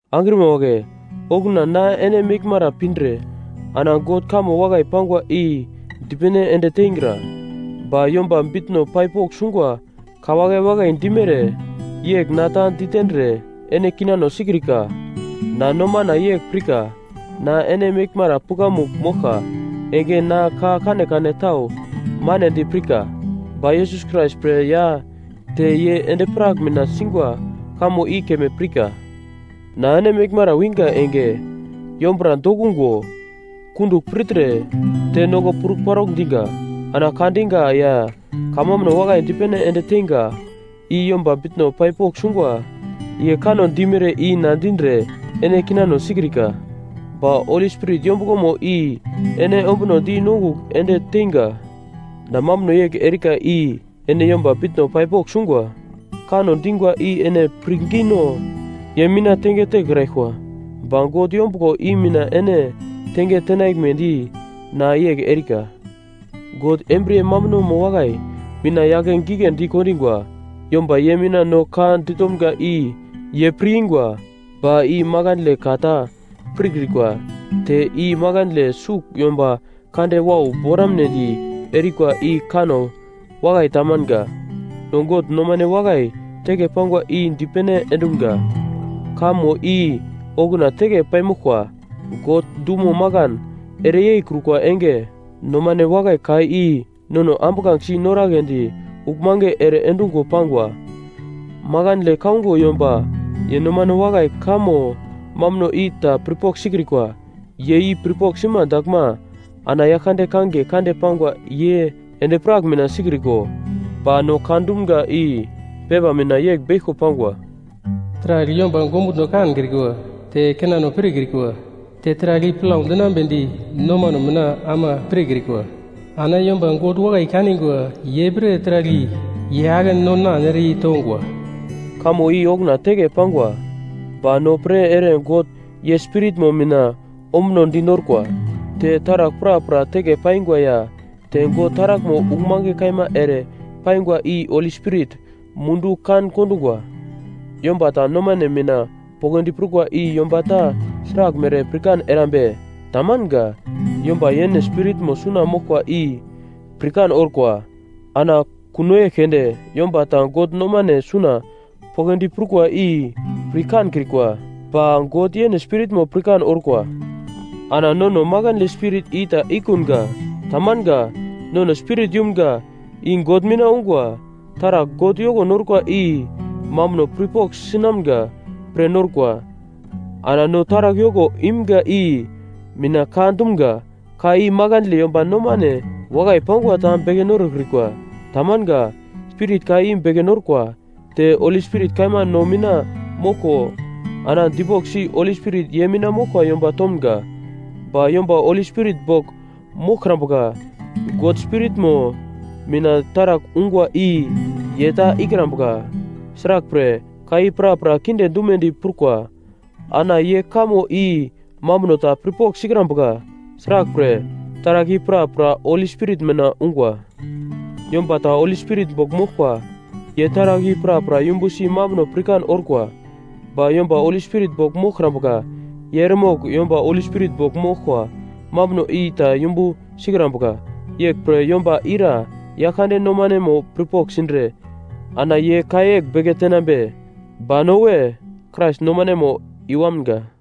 Angrima wagle, okuna na ene meglmara pindre ana God kamo wakai pangwa i dipene ende teingra, ba yomba bitno pai pogl sungwa ka wakai wakai dimere yegl na ta ditendre ene kinano sikrika. Na nomana yegl pirka na ene meglmara pukamugl moglka enge na ka kanekane tau manedi pirka, ba Yesus Krais pre ya te ye endi-prak mina singwa kamo i keme pirka. Na ene meglmara wingwa enge yombura dokungo, kundugl pirtre te noko purparaugl diga. Ana ka diga ya kamambuno wakai dipene ende teinga i yomba bitno pai pogl sungwa ye kanno dimere i na dindre ene kinano sikrika, ba Holi Spirit yombuglomo i ene ombunodi nongugl ende teinga. Na mambuno yegl erika i ene yomba bitno pai pogl sungwa kanno dingwa i ene pirngino ye mina tenge tekraglkwa, ba God yombuglo i mina ene tenge tenaglmedi na yegl erika. God embriye mambunomo wakai mina yake giglendi kondingwa yomba ye mina no ka ditomga i ye pir-ingwa, ba i makandle ka ta pirkrikwa. Te i makandle sugl yomba kande wau boramunedi erikwa i kanno wakai tamanga. No God nomane wakai teke pangwa i dipene endumga, kamo i okuna teke paimoglkwa. God dumo makan ere yeikrukwa enge, nomane wakai ka i nono ambuglangesi noragledi uglmange ere endungwa pangwa. Makandle kaungo yomba ye nomano wakai kamo mambuno i ta pirpogl sikrikwa. Ye i pirpogl sima daglma ana Yaglkande kangiye kande pangwa ye endi-prak mina sikriko. Ba no ka dumga i pepa mina yegl beglko pangwa: “Taragl yomba ongumutno kankrikwa, te kinano pirkrikwa, te taragl i plau dinambedi nomano mina ama pirkrikwa, ana yomba God wakai kaningwa ye pre taragl i ye ake non-nan ere yeitongwa.” Kamo i okuna teke pangwa, ba no pre ere God ye Spiritmo mina ombunodi norkwa. Te taragl prapra teke paingwa ya te God taraglmo uglmange kaima ere paingwa i Holi Spirit mundu kan-kondungwa. Yomba ta nomane mina poglodi prukwa i yomba ta sraglmere pirkan erambe? Tamanga. Yomba yene spiritmo suna moglkwa i pirkan orkwa. Ana kuno yegl keunde yomba ta God nomane suna poglodi prukwa i pir kankrikwa, ba God yene Spiritmo pirkan orkwa. Ana nono makandle spirit i ta ikunga. Tamanga. Nono Spirit yumga, i God mina ungwa. Taragl God yoko norkwa i mambuno pirpogl sinamga pre norkwa. Ana no taragl yoko imga i mina ka dumga. Ka i makandle yomba nomane wakai pangwa ta beke norokrikwa. Tamanga. Spirit ka i beke norkwa. Te Holi Spirit kaima no mina moglko ana dipoglsi Holi Spirit ye mina moglkwa yomba tomga. Ba yomba Holi Spirit bogl moglkrambuka, God Spiritmo mina taragl ungwa i ye ta ikrambuka. Sraglpre, ka i prapra kinde dumedi prukwa. Ana ye kamo i mambuno ta pirpogl sikrambuka; sraglpre, taragl i prapra Holi Spirit mina ungwa. Yomba ta Holi Spirit bogl moglkwa ye taragl i prapra yumbusi mambuno pirkan orkwa. Ba yomba Holi Spirit bogl moglkrambuka ye eremogl yomba Holi Spirit bogl moglkwa mambuno i ta yumbu sikrambuka, “Yeglpre yomba ira Yaglkande nomanemo pirpogl sindre, ana ye ka yegl beke tenambe?” Ba no we, Krais nomanemo i-wamga.